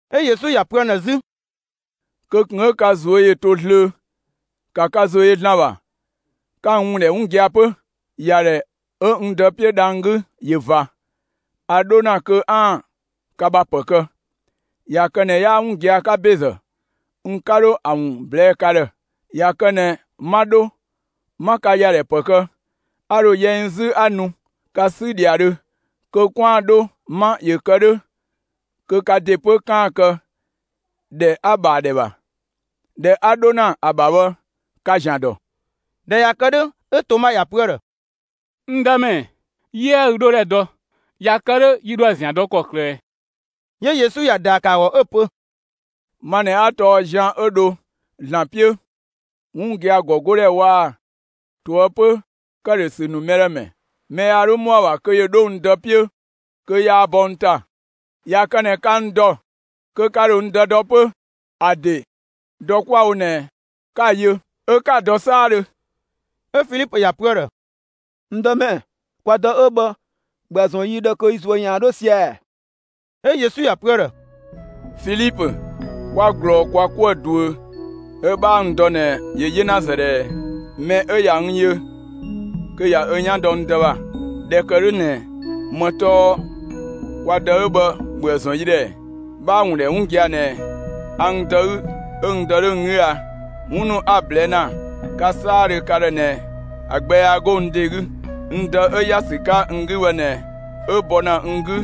'Ö Yesu ‑ya pö ‑an ‑dhë 'zü: «Kö ꞊kun 'ö ka ꞊zuö' ‑yö to zlöö. ‑Ka ka ‑zo yö ‑Zlan ‑bha, 'ka n ‑wun ‑dhɛ 'wun gia‑ 'pö. ‑Yadhɛ 'ö n Dë 'piö dhang‑ 'gü ‑yö ꞊va; a 'dho ‑na kö 'aan‑ ka ‑bha ‑pë kë. ꞊Ya kë ꞊nɛ 'yaa 'wun gia‑ 'ka ‑bezë, n 'ka 'dho ‑a ‑wun ꞊blɛɛ' ka ‑dhë. ꞊Ya kë ꞊nɛ 'ma 'dho, 'ma ka ‑yadhɛ ‑pë kë, a ‑dho yɛ n 'zü 'a nu ka 'sü ‑dhiadhö kö 'kwaan‑ 'dho 'ma; ‑yö kë 'dhö kö ka ‑de 'pö 'kaan‑ kë ‑dhɛ 'a‑ ‑bha ‑a ‑dhɛ ‑bha. ‑Dhɛ 'a 'dho ‑na ‑a ‑bha bhë, ka‑ ‑zian ‑dɔ.» ꞊Dhɛ ꞊ya kë 'dhö, 'ö Toma ‑ya pö ‑a ‑dhë: «N Dëmɛ, 'yiëë ü 'dhodhɛ dɔ. ꞊Ya kë 'dhö yi ‑dho ‑a ‑zian dɔ ‑kɔklë ꞊ɛ?» 'Yö Yesu ‑ya ‑daa ‑kë ‑a ‑gɔ 'ö‑ pö: «Ma ꞊nɛ 'a tɔɔ zian 'ö dho ‑Zlan 'piö, 'wun gia‑ ‑gɔ 'godhɛ waa‑ ꞊toëpö ‑këdhösü ‑nu mɛ ‑dhë ‑mɛ. Mɛ yaa 'dho ‑mɔa ‑bha kö ‑yö 'dho n Dë 'piö kö yaa bɔ n ‑ta. ꞊Ya kë ꞊nɛ ka n ‑dɔ kö ka ‑dho n Dë dɔ 'pö. ‑A ‑de dɔ 'kwa‑ wo ꞊nɛ 'ka‑ yö, 'ö 'ka‑ dɔ 'saadhö.» 'Ö Filipö ‑ya pö ‑a ‑dhë: «N Dëmɛ, kwa Dë 'ö bhë, ‑bhöë ‑zɔn yi ‑dhë kö yi ꞊zuö' ‑yaan 'dho sia‑ ‑ɛ.» 'Ö Yesu ‑ya pö ‑a ‑dhë: «Filipö, 'kwa ꞊glɔɔ kwa 'kuë‑ ꞊duö 'ö 'bhaa n dɔ ꞊nɛ, ‑yö 'yenazë ꞊dhɛɛ! Mɛ 'ö ꞊ya n yö kö ꞊ya ö 'yan dɔ n Dë ‑bha. ꞊Dhɛ ‑kë 'dhö ꞊nɛ ‑më tɔɔ ‹kwa Dë 'ö bhë ‑bhöë ‑zɔn yi ‑dhë› ‑ɛ? 'Bhaa‑ ‑wun ‑dhɛ 'wun gia‑ ꞊nɛ a n Dë 'gü 'ö n Dë 'dhö n 'gü a? 'Wun ‑nu 'a‑ ꞊blɛɛ' ‑na ka 'saadhö ka ‑dhë ꞊nɛ ‑a gbɛ yaa 'go n ‑de 'gü. N Dë 'ö ‑ya ‑sü 'ka n 'gü bhë ꞊nɛ 'ö bɔ ‑na n 'gü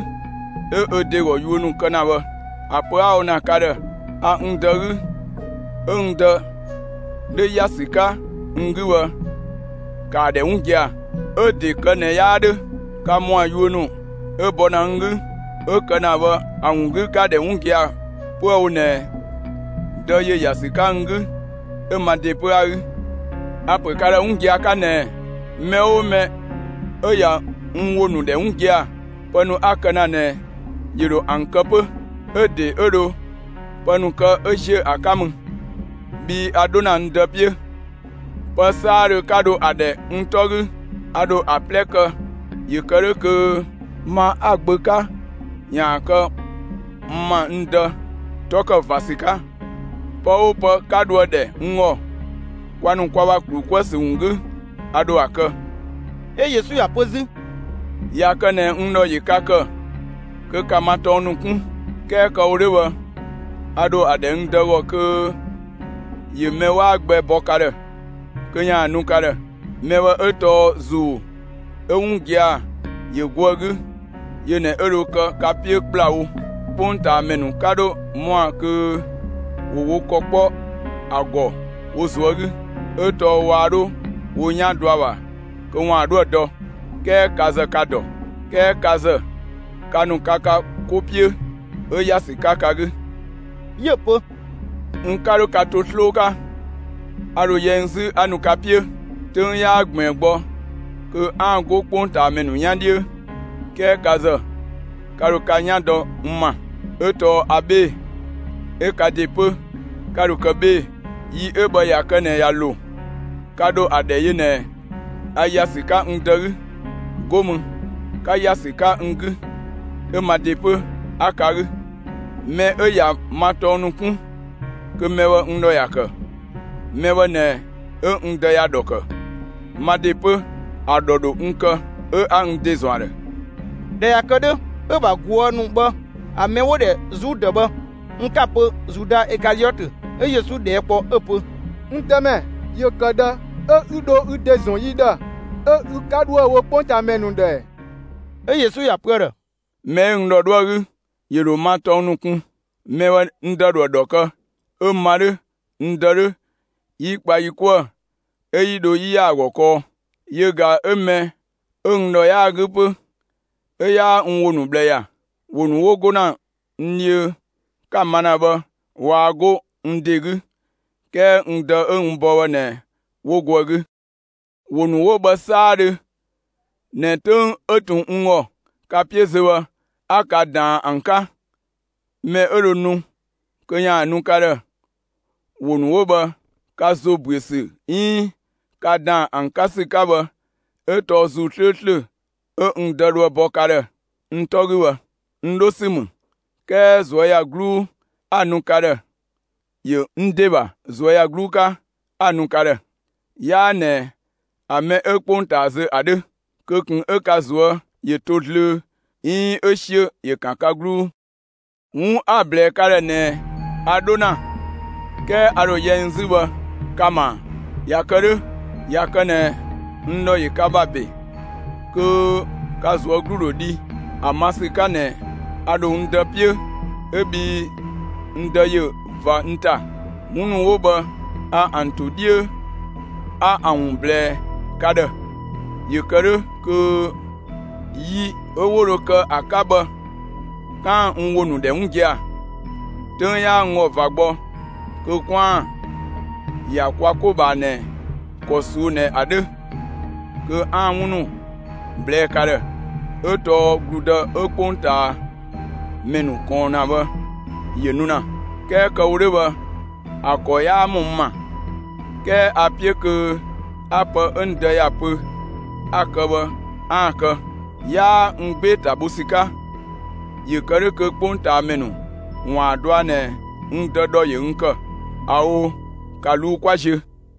'ö ö ‑de ‑gɔ ‑yuö ‑nu kë ‑na bhë. ‑A pö 'a‑ wo ‑na ka ‑dhë a n Dë 'gü 'ö n Dë 'dhö ‑ya ‑sü 'ka n 'gü bhë, ‑kaa ‑dhɛ 'wun gia‑. 'Ö‑ ‑de kë ꞊nɛ 'yaa 'dhö, ka ‑mɔa yuö ‑nu 'ö bɔ ‑na n 'gü 'ö‑ kë ‑na bhë ‑a ‑wun 'gü, ka‑ ‑dhɛ 'wun gia‑ 'püë‑ wo ꞊nɛ Dë ‑yö ‑ya ‑sü 'ka n 'gü 'ö ma ‑de 'pö 'a‑ 'gü. A‑ ‑pö ka ‑dhë 'wun gia‑ 'ka ꞊nɛɛ: Mɛ 'oo mɛ 'ö ꞊ya n ‑wo ‑nu ‑dhɛ 'wun gia‑, pë ‑nu 'a‑ kë ‑na ꞊nɛ ‑yö ‑dho ‑an kë 'pö. 'Ö‑ ‑de 'ö dho pë ‑nu kë 'ö ‑ziö ‑a 'ka mü, bhii a 'dho ‑na n Dë 'piö. Pë 'saadhö 'ka dho ‑a ‑dhɛ n 'tɔ 'gü, a ‑dho ‑a 'plɛ kë ‑yö kë 'dhö kö ma 'a‑ Gbö 'ka bhë, ‑yaan kë n ‑ma n Dë 'tɔ kë ꞊va ‑sü 'ka. Pë 'oo pë 'ka dhoë‑ ‑dhɛ n ‑gɔ, kwa ‑nu kwa ‑bha ‑klu 'kuë‑ ‑sü ‑wun 'gü, a ‑dho ‑a kë.» 'Ö Yesu ‑ya pö 'zü: «꞊Ya kë ꞊nɛ n ‑dhɔ ‑yö ka ‑kë, kö ‑ka ma tɔng ‑nu 'kun. 'Kɛɛ kë‑ wo 'dhö bhë, a ‑dho ‑a ‑dhɛ n Dë ‑gɔ kö ‑yö mɛ 'waa gbɛ bɔ ka ‑dhë kö ‑yaan nu ka ‑dhë. Mɛ bhë 'ö tɔɔ ‑Zuu 'ö 'wun gia‑ ‑yö go ‑a 'gü. Yö ꞊nɛ 'ö dho kë ka 'piö ‑kplawo. 'Kpongtaamɛ ‑nu 'ka 'dhö ‑mɔa kö ‑wo wo ‑kɔ 'kpɔ ‑a ‑gɔ wo ꞊zuö' 'gü; 'ö tɔɔ waa 'dho wo 'yan dɔ ‑a ‑bha kö ‑waan 'dhoë‑ dɔ. 'Kɛɛ ka ‑zë ka‑ ‑dɔ; 'kɛɛ ka ‑zë, ka ‑nu ka ka 'ko 'piö, 'ö ‑ya ‑sü 'ka ka 'gü.» 'Yö‑ pö: «N 'ka 'dho ka to 'sloo 'ka; a ‑dho yɛ n 'zü 'a nu ka 'piö. 'Töng 'yaa ꞊gbiin gbɔ kö 'aan‑ 'go 'kpongtaamɛ ‑nu 'yan 'dhiö; 'kɛɛ ka ‑zë, ka ‑dho ka 'yan dɔ n ‑ma, 'ö tɔɔ a 'bhee‑, 'ö ka ‑de 'pö, 'ka dho kë 'bhee‑. Yi 'ö bhë ꞊ya kë ꞊nɛ ꞊ya ‑lo, ka ‑dho ‑a ‑dhɛ yö ꞊nɛ a ‑ya ‑sü 'ka n Dë 'gü, 'go mü, 'ka ‑ya ‑sü 'ka n 'gü; 'ö ma ‑de 'pö, 'a ka 'gü. Mɛ 'ö ꞊ya ma tɔng ‑nu 'kun, kö mɛ bhë n ‑dhɔ ‑ya ‑kë. Mɛ bhë ꞊nɛ 'ö n Dë ‑ya ‑dhɔ ‑kë. Ma ‑de 'pö, ‑a ‑dhɔ ‑dho n kë 'ö 'a n ‑de ‑zɔn ‑a ‑dhë.» ꞊Dhɛ ꞊ya kë 'dhö, 'ö‑ ‑bha ꞊guë' ‑nu bhë ‑a mɛ 'wo‑ ‑dhɛ Zudë bhë, (n 'ka‑ pö Zuda Ikaliɔtö,) 'ö Yesu ꞊dhɛɛ' kpɔ 'ö‑ pö: «N Dëmɛ, ‑yö ‑kë ꞊dhë 'ö 'ü dho ü ‑de ‑zɔn yi ‑dhë, 'ö ü 'ka 'dhoë‑ wo 'kpongtaamɛ ‑nu ‑dhë ‑ɛɛ?» 'Ö Yesu ‑ya pö ‑a ‑dhë: «Mɛ 'ö n ‑dhɔ 'dhoë‑ 'gü, ‑yö ‑dho n ‑ma tɔng ‑nu kun. Mɛ bhë n Dë ‑dhoë ‑dhɔ kë, 'ö ma 'dhö, n Dë 'dhö, 'yi kpa yi 'kuë‑ 'ö 'yi dho 'yi ‑ya ‑a ‑gɔ kɔɔ. Yö ꞊ga 'ö mɛ 'ö n ‑dhɔ 'yaa‑ 'gü 'pö, 'ö 'yaa n ‑wo ‑nu ꞊bhlë ‑ya. ‑Wo ‑nu 'wo 'go ‑na n dhiö 'ka‑ ma ‑na bhë, waa 'go n ‑de 'gü; 'kɛɛ n Dë 'ö n bɔ bhë ꞊nɛ 'wo go ‑a 'gü. ‑Wo ‑nu 'wo bhë 'saadhö ꞊nɛ 'töng 'ö ꞊tun n ‑gɔ ka 'piö zö bhë, 'a ka ꞊daan ‑an 'ka. Mɛ 'ö dho nu kö ‑yaan nu ka ‑dhë, ‑wo ‑nu 'wo bhë, ka ‑zo ‑büö ‑sü 'iin ka ‑daan ‑an 'ka ‑sü 'ka bhë 'ö tɔɔ ‑Zuu 'slööslö 'ö n Dë dhoë‑ bɔ ka ‑dhë n 'tɔ 'gü bhë. N 'dho ‑sü ‑mü; 'kɛɛ ꞊zuöyagluu 'a‑ nu ka ‑dhë. ‑Yö n ‑de ‑bha ꞊zuöyagluu 'ka, 'a‑ nu ka ‑dhë. 'Yaa ꞊nɛ ‑a mɛ 'ö 'kpongtaa zö ‑a 'dhö. Kö ꞊kun 'ö ka ꞊zuö' ‑yö to zlöö 'iin 'ö 'siö ‑yö ‑kan ka 'gluu. 'Wun 'a‑ ꞊blɛɛ ka ‑dhë ꞊nɛɛ ‹a 'dho ‑na, 'kɛɛ a ‑dho yɛ n 'zü› bhë, ka‑ ma ‑a! ꞊Ya kë 'dhö, ꞊ya kë ꞊nɛ n ‑dhɔ ‑yö ka ‑bha ‑be, kö ka ꞊zuö' 'glu ‑dho dhi ‑a ma ‑sü 'ka ꞊nɛ a ‑dho n Dë 'piö 'ö bhii n Dë ‑yö ꞊va n ‑ta. 'Wun ‑nu 'wo bhë a ‑an ‑to 'dhiö 'a ‑an ‑wun ꞊blɛɛ ka ‑dhë, ‑yö kë 'dhö kö yi 'ö 'wo dho kë ‑a 'ka bhë 'kaan‑ n ‑wo ‑nu ‑dhɛ 'wun gia‑. 'Töng 'yaa n ‑gɔ ꞊va gbɔ kö 'kwaan‑ ‑ya kwa 'ko ꞊bhaa ꞊nɛ ‑kɔ ꞊suu'‑ ꞊nɛ ‑a 'dhö, kö 'aan‑ 'wun ‑nu ꞊blɛɛ' ka ‑dhë, 'ö tɔɔ ‑gludë 'ö 'kpongtaamɛ ‑nu ꞊kɔɔn ‑na bhë ‑yö nu ‑na. 'Kɛɛ kë‑ wo 'dhö bhë ‑a ‑kɔ 'yaa ‑mɔ n ‑ma. 'Kɛɛ a‑ 'piö kö 'a pë 'ö n Dë ‑ya pö 'a‑ kë bhë 'aan‑ kë; 'yaa n 'gbee‑ ‑ta bho ‑sü 'ka; ‑yö ‑kë 'dhö kö 'kpongtaamɛ ‑nu ‑waan ‑a dɔa ꞊nɛ n Dë ‑dhɔ ‑yö n ‑kë. ꞊Ao', ‑ka ꞊luu', 'kwa ziö!»